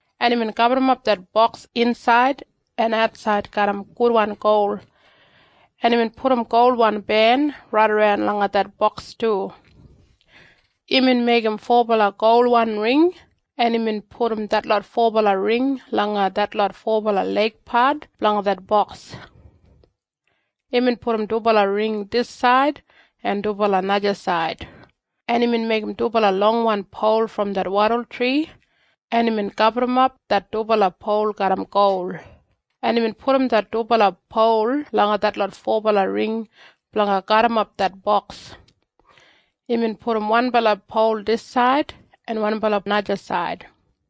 en imbin gaburrumap det Boks insaid en atsaid garram gudwan gol, en imbin pudum golwan ben raidaran langa det boks du. Imbin meigim fobala golwan ring, en imbin pudum detlot fobala ring langa detlot fobala leigpat blanga det Boks. Imbin pudum dubala ring disaid en dubala najasaid, en imbin meigim dubala longwan pol brom det wadultri, en imbin gaburrumap det dubala pol garram gol, en imbin pudum det dubala pol langa detlot fobala ring blanga garrimap det Boks. Imbin pudum wanbala pol disaid en wanbala najasaid.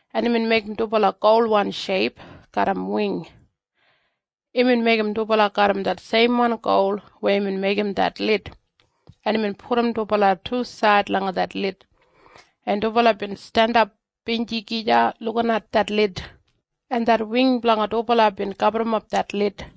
en imbin meigim dubala golwan sheip garram wing. Imbin meigim dubala garram det seimwan gol weya imbin meigim det lid, en imbin pudum dubala tusaid langa det lid, en dubala bin jandap feis gija lukinat det lid, en det wing blanga dubala bin gaburrumap det lid.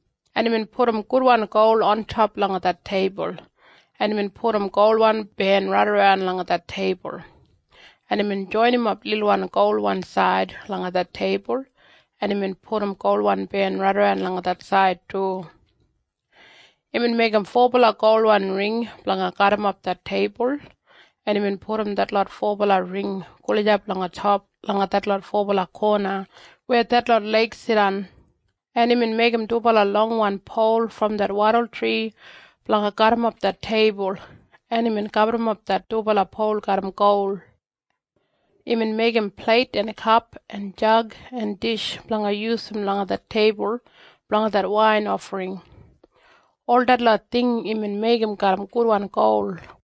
en imbin pudum gudwan gol ontop langa det teibul, en imbin pudum golwan ben raidaran langa det teibul, en imbin joinimap lilwan golwan said langa det teibul, en imbin pudum golwan ben raidaran langa det said du. Imbin meigim fobala golwan ring blanga garrimap det teibul, en imbin pudum detlot fobala ring gulijap langa top langa detlot fobala kona weya detlot leig jidan, en imbin meigim dubala longwan pol brom det wadultri blanga garrimap det teibul, en imbin gaburrumap det dubala pol garram gol. Imbin meigim pleit en kap en jag en dish blanga yusum langa det teibul blanga det wain ofring. Ol detlot ting imbin meigim garram gudwan gol.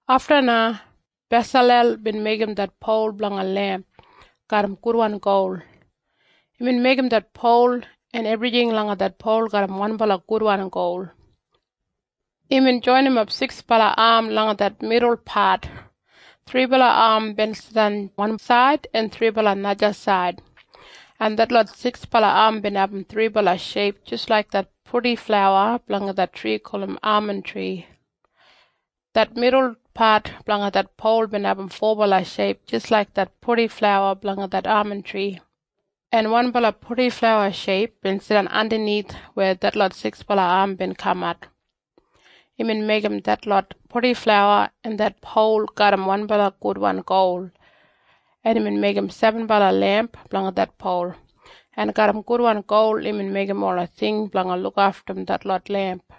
Afta na Besalel bin meigim det pol blanga lemp garram gudwan gol. Imbin meigim det pol en ebrijing langa det pol garram wanbala gudwan gol. Imbin joinimap siksbala am langa det midulpat. Thribala am bin jidan wansaid en thribala najasaid, en detlot siksbala am bin abum thribala sheip jis laik det purdiflawa blanga det tri gulum amantri. Det midul pat blanga det pol bin abum fobala sheip jis laik det purdiflawa blanga det amantri, en wanbala purdiflawa sheip bin jidan andanith weya detlot siksbala am bin kamat. Imbin meigim detlot purdiflawa en det pol garram wanbala gudwan gol, en imbin meigim sebenbala lemp blanga det pol, en garram gudwan gol imbin meigim ola ting blanga lukaftum detlot lemp.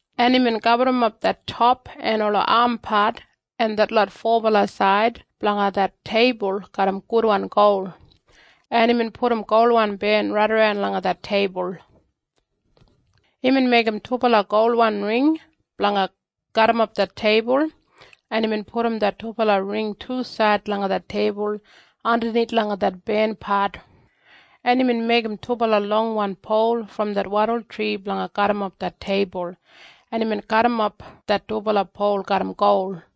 en imbin gaburrumap det top en ola ampat en detlot fobala said blanga det teibul garram gudwan gol, en imbin pudum golwan ben raidaran langa det teibul. Imbin meigim dubala golwan ring blanga garrimap det teibul, en imbin pudum det dubala ring tusaid langa det teibul andanith langa det benpat, en imbin meigim dubala longwan pol brom det wadultri blanga garrimap det teibul, en imbin gaburrumap det dubala pol garram gol.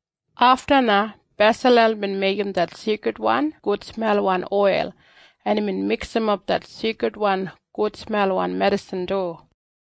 Afta na Besalel bin meigim det seikridwan gudsmelwan oil, en imbin miksimap det seikridwan gudsmelwan medisin du.